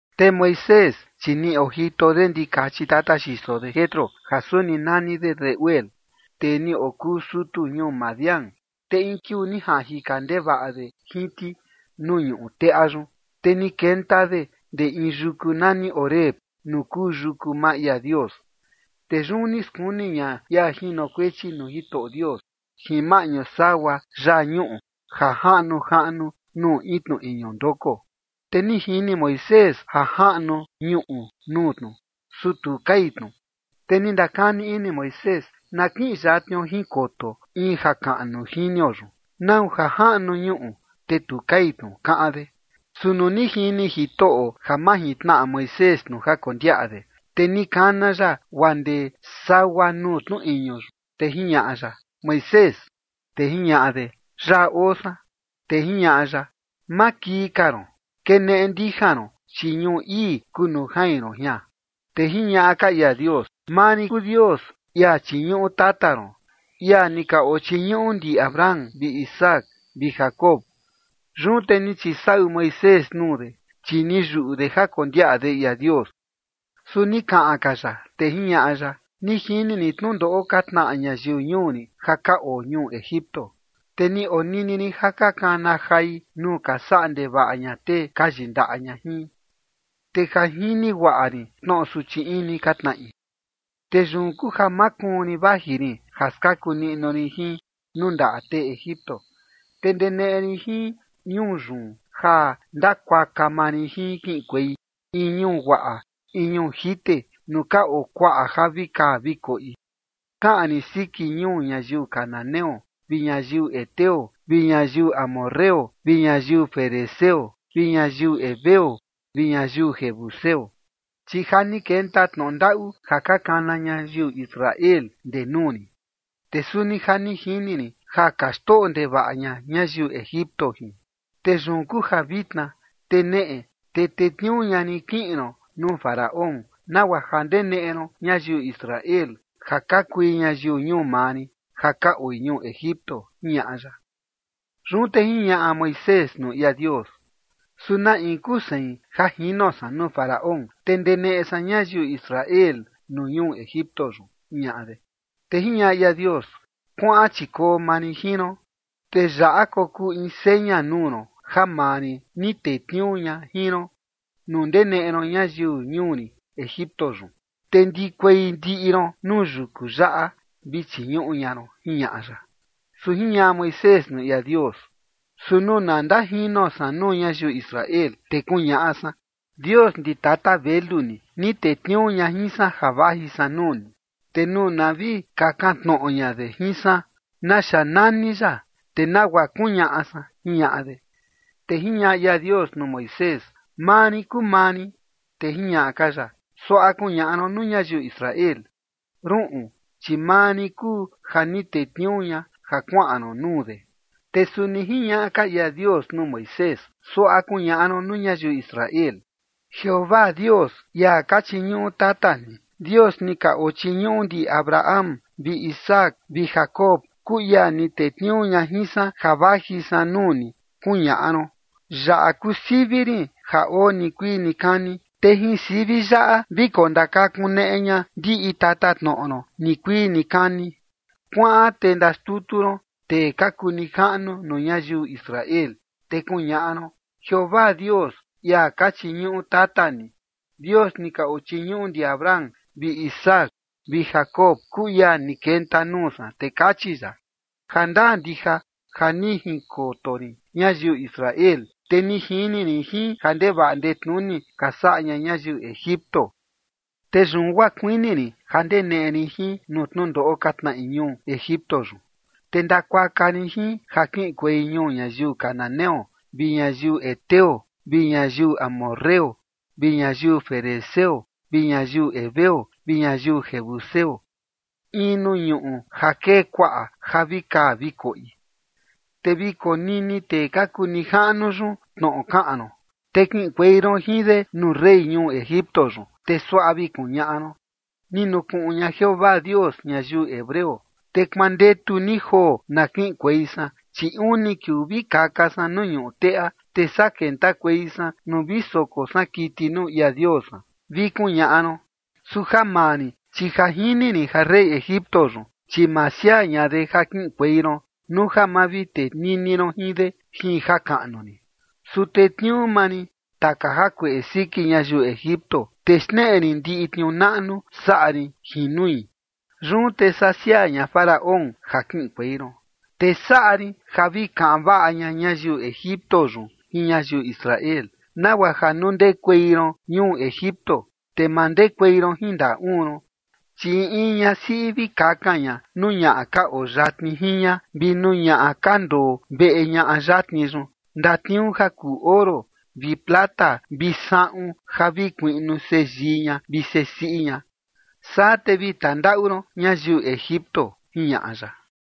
Te Moisés chi ni ojito de ndikachi tata xiso de Jetro ja suni nani de Reuel, tee ni okuu sutu ñuu Madián. Te in kiuu ni jaꞌan jika ndevaꞌa de jin ti nuu ñuꞌu teꞌa yun, te ni kenta de ndee in yuku nani Horeb nuu kuu yuku maa ia Dios. Te yun ni skuni ña ia jinokuechi nuu Jitoꞌo Dios jin maꞌñu sagua yaa ñuꞌu ja jaꞌnu jaꞌnu nuu in tnu iñu ndoko. Te ni jini Moisés ja jaꞌnu ñuꞌu nuu tnu, su tu kai tnu. Te ni ndakani ini Moisés: “Na kiꞌin yatnio jinkoto in jakaꞌnu jinio yun, nau ja jaꞌnu ñuꞌu, te tu kai tnu” kaꞌan de. Su nuu ni jini Jitoꞌo ja majintnaꞌa Moisés tnu ja kondiaꞌa de, te ni kana ya guaa ndee sagua nuu tnu iñu yun, te jiñaꞌa ya: ―Moisés. Te jiñaꞌa de: ―Yaꞌa oo san. Te jiñaꞌa ya: ―Ma kii ka ron. Keneꞌe ndija ron, chi ñuꞌu ii kuu nuu jain ron jian. Te jiñaꞌa ka ia Dios: ―Maa rin kuu Dios, ia chiñuꞌu tata ron, ia ni ka ochiñuꞌu ndi Abraham vi Isaac vi Jacob. Yun te ni chisaꞌu Moisés nuu de, chi ni yuꞌu de ja kondiaꞌa de ia Dios. Su ni kaꞌan ka ya, te jiñaꞌa ya: ―Ni jini rin tnundoꞌo ka tnaꞌa ñayiu ñuu rin ja ka oo ñuu Egipto, te ni onini rin ja ka kana jai nuu ka saꞌa ndevaꞌa ña tee ka yindaꞌa ña jin. Te ja jini guaꞌa rin tnoꞌo suchi ini ka tnaꞌi. Te yun kuu ja makuun rin vaji rin ja skaku niꞌnu rin jin nuu ndaꞌa tee Egipto, te ndeneꞌe rin jin ñuu yun ja ndakuaka maa rin jin kiꞌinkuei in ñuu guaꞌa, in ñuu jite, nuu ka oo kuaꞌa ja vi kaa vi koꞌi, kaꞌan rin siki ñuu ñayiu cananeo vi ñayiu heteo vi ñayiu amorreo vi ñayiu ferezeo vi ñayiu heveo vi ñayiu jebuseo. Chi ja ni kenta tnoꞌo ndaꞌu ja ka kana ñayiu Israel ndee nuu rin, te suni ja ni jini rin ja ka xtoꞌo ndevaꞌa ña ñayiu Egipto jin. Te yun kuu ja vitna, te neꞌe, chi tetniuu ña rin kiꞌin ron nuu Faraón, nagua ja ndeneꞌe ron ñayiu Israel ja ka kui ñayiu ñuu maa rin ja ka oi ñuu Egipto ―jiñaꞌa ya. Yun te jiñaꞌa Moisés nuu ia Dios: ―¿Su na in kuu sein ja jino san nuu Faraón, te ndeneꞌe san ñayiu Israel nuu ñuu Egipto yun? ―jiñaꞌa de. Te jiñaꞌa ia Dios: ―Kuaꞌan chi koo maa rin jin ron, te yaꞌa kokuu in seña nuu ron ja maa rin ni tetniuu ña jin ron: Nuu ndeneꞌe ron ñayiu ñuu rin Egipto yun, te ndikuei ndiꞌi ron nuu yuku yaꞌa vi chiñuꞌu ña ron ―jiñaꞌa ya. Su jiñaꞌa Moisés nuu ia Dios: ―Su nuu na ndajino san nuu ñayiu Israel, te kuñaꞌa san: “Dios ndi tata velu ni, ni tetniuu ña jin san ja vaji san nuu ni”, te nuu na vi kakan tnoꞌo ña de jin san: “¿Naxa nani ya?”, te ¿nagua kuñaꞌa san? ―jiñaꞌa de. Te jiñaꞌa ia Dios nuu Moisés: ―Maa rin kuu maa rin. Te jiñaꞌa ka ya: ―Suaꞌa kuñaꞌa ron nuu ñayiu Israel: “Ruꞌun, chi maa rin kuu ja ni tetniuu ña ja kuaꞌan ron nuu de”. Te suni jiñaꞌa ka ia Dios nuu Moisés: ―Suaꞌa kuñaꞌa ron nuu ñayiu Israel: “Jeovaa Dios, ia ka chiñuꞌu tata ni, Dios ni ka oo chiñuꞌu ndi Abraham vi Isaac vi Jacob kuu ia ni tetniuu ña jin san ja vaji san nuu ni”, kuñaꞌa ron. Yaꞌa kuu sivi rin ja oo nikuii nikani, te jin sivi yaꞌa vi kondakakuneꞌe ña ndiꞌi tatatnoꞌo ron nikuii nikani. Kuaꞌan te ndaxtutu ron tee ka kuu nijaꞌnu nuu ñayiu Israel te kuñaꞌa ron: “Jeovaa Dios, ia ka chiñuꞌu tata ni, Dios ni ka ochiñuꞌu ndi Abraham vi Isaac vi Jacob kuu ia ni kenta nuu san, te kachi ya: Jandaa ndija ja ni jinkoto rin ñayiu Israel, te ni jini rin ja ndevaꞌa ndetnuni ka saꞌa ña ñayiu Egipto. Te yun guaa kuini rin ja ndeneꞌe rin jin nuu tnundoꞌo ka tnaꞌi ñuu Egipto yun, te ndakuaka rin jin ja kiꞌinkuei ñuu ñayiu cananeo vi ñayiu heteo vi ñayiu amorreo vi ñayiu ferezeo vi ñayiu heveo vi ñayiu jebuseo, in nuu ñuꞌu ja kee kuaꞌa ja vi kaa vi koꞌi.” Te vi konini tee ka kuu nijaꞌnu yun tnoꞌo kaꞌan ron, te kiꞌinkuei ron jin de nuu rey ñuu Egipto yun, te suaꞌa vi kuñaꞌa ron: “Ni nukuꞌun ña Jeovaa Dios ñayiu hebreo. Te kuandetu ni joo na kiꞌinkuei san, chi uni kiuu vi kaka san nuu ñuu teꞌa, te saa kentakuei san nuu vi soko san kiti nuu ia Dios san”, vi kuñaꞌa ron. Su ja maa rin, chi ja jini rin ja rey Egipto yun, chi ma siaa ña de ja kiꞌinkuei ron nuu ja ma vi tenini ron jin de jin jakaꞌnu rin. Su tetniuu maa rin taka jakueꞌe siki ñayiu Egipto, te xneꞌe rin ndiꞌi tniuu naꞌnu saꞌa rin jin nui. Yun te saa siaa ña Faraón ja kiꞌinkuei ron. Te saꞌa rin ja vi kaꞌan vaꞌa ña ñayiu Egipto yun jin ñayiu Israel, nagua ja nuu ndekuei ron ñuu Egipto yun, te ma ndekuei ron jin ndaꞌa uun ron. Chi in in ñasiꞌi vi kakan ña nuu ñaꞌa ka oo yatni jin ña vi nuu ñaꞌa ka ndoo veꞌe ñaꞌa yatni yun ndatniuu ja kuu oro vi plata vi saꞌun ja vi kuiꞌnu seyii ña vi sesiꞌi ña. Saa te vi tandaꞌu ron ñayiu Egipto ―jiñaꞌa ya.